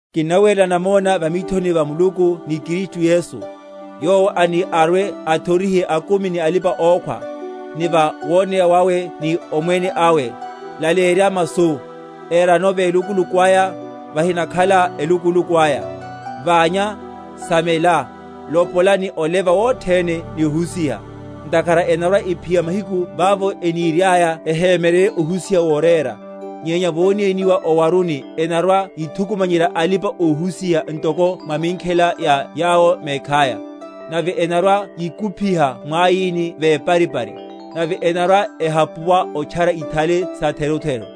Kinnawerela namona va mithoni va Muluku ni Kristu Yesu, yowo ani arwe‐athorihe akumi ni alipa‐okhwa, ni va woneya wawe ni omwene awe; laleyerya masu; erano velukuluku aya, vahinakhala elukuluku aya; ványa, samela, lopola, ni oleva wothene ni ohusiha. Ntakhara enarwa‐ephiya mahiku vavo eniriaya ehemyeryerye ohusiha worérela; nyenya vónéniwa o’waruni enarwa‐yithukumanyerya alipa‐ohusiha ntoko mwa minkhela ya yawo mekhaya: nave enarwa‐yikuphyiha mwaíni veparipari, nave enarwa?-?ehapuwa otchara ithale satherutheru.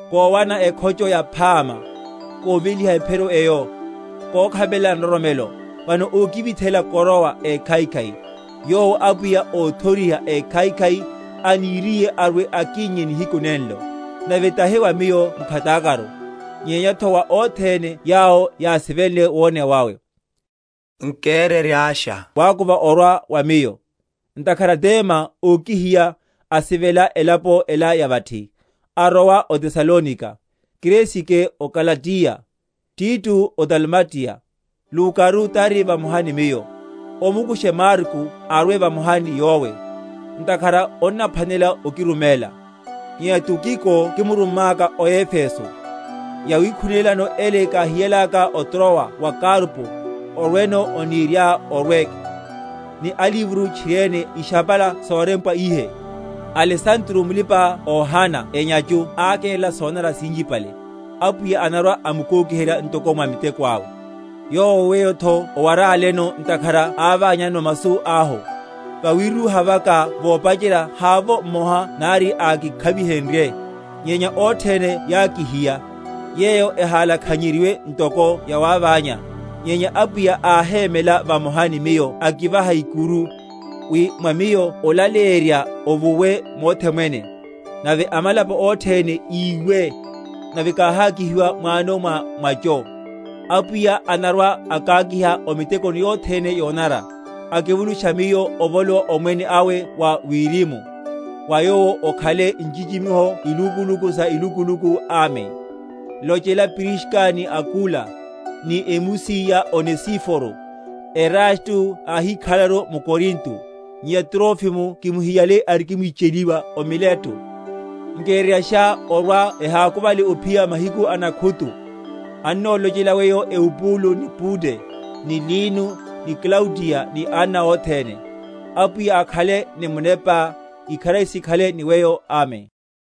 Kówana ekhocho yaphama, kóveliha ephiro eyo, kókhapelela nroromelo: Vano ókivithela koroa ékhaikhai, yowo Apwiya, óthoriha ékhaikhai, aniriye arwe‐akinnye nihiku nenlo: nave tahi wa miyo mkhatakaru, nyenyatho wa othene yawo yásivenle woneya wawe. Nkereryasha wákuva orwa wa miyo: Ntakhara Dema ókihiya, asivela elapo ela ya vathi, arowa o Tesalonika; Kresike o Galatiya, Tito o Dalimatiya. Lukaru tari vamoha ni miyo. Omukushe Marko, arwe vamoha ni yowe; ntakhara onnaphwanela okiruméla. Nyenya Tukiko kimurummaka o Efeso. Yawikhunélano ele káhiyalaka o Trowa wa Karpo, orweno oniriá orweke, ni alivro, tchiriene ishapala sorempwa ihe. Alesandro muli‐pa‐ohana enyachu ákerela sonanara sinchipale: Apwiya anarwa‐amukókiherya ntoko mwa miteko awe; yowo weyotho owaráleno; ntakhara áványanano masu ahu. Vawírúha vaka vopacherya havovo mmoha nari ákikhavihenrye, nyenya othene yákihiya; yeyo ehalakhanyeryiwe ntoko yawáványa. Nyenya Apwiya áhémela vamoha ni miyo akivaha ikuru; wi mwa miyo olaleyerya ovuwe mothe mwene, nave amalapo othene yiwe; nave káhákihi‐wa mwano mwa mwacho. Apwiya anarwa‐akákiha o mitekoni yothene yonanara, akivulusha miyo ovolowa omwene awe wa wiri‐mu; wa Yowo okhale nchichimiho ilukuluku sa ilukuluku. Amen. Lochela Priska ni Akula, ni emusi ya Onesiforo. Erasto áhíkhalelaru m’Korinto; nyenya Trofimo kimuhiyale arikimwi‐cheliwa o Mileto. Nkereryasha orwa ehákuvale ophiya mahiku a nakhutu. Annolochela weyo Eubulo, ni Pude, ni Lino, ni Klaudiya, ni anna othene. Apwiya akhale ni munepá. Ikharari sikhale ni weyo. Amen.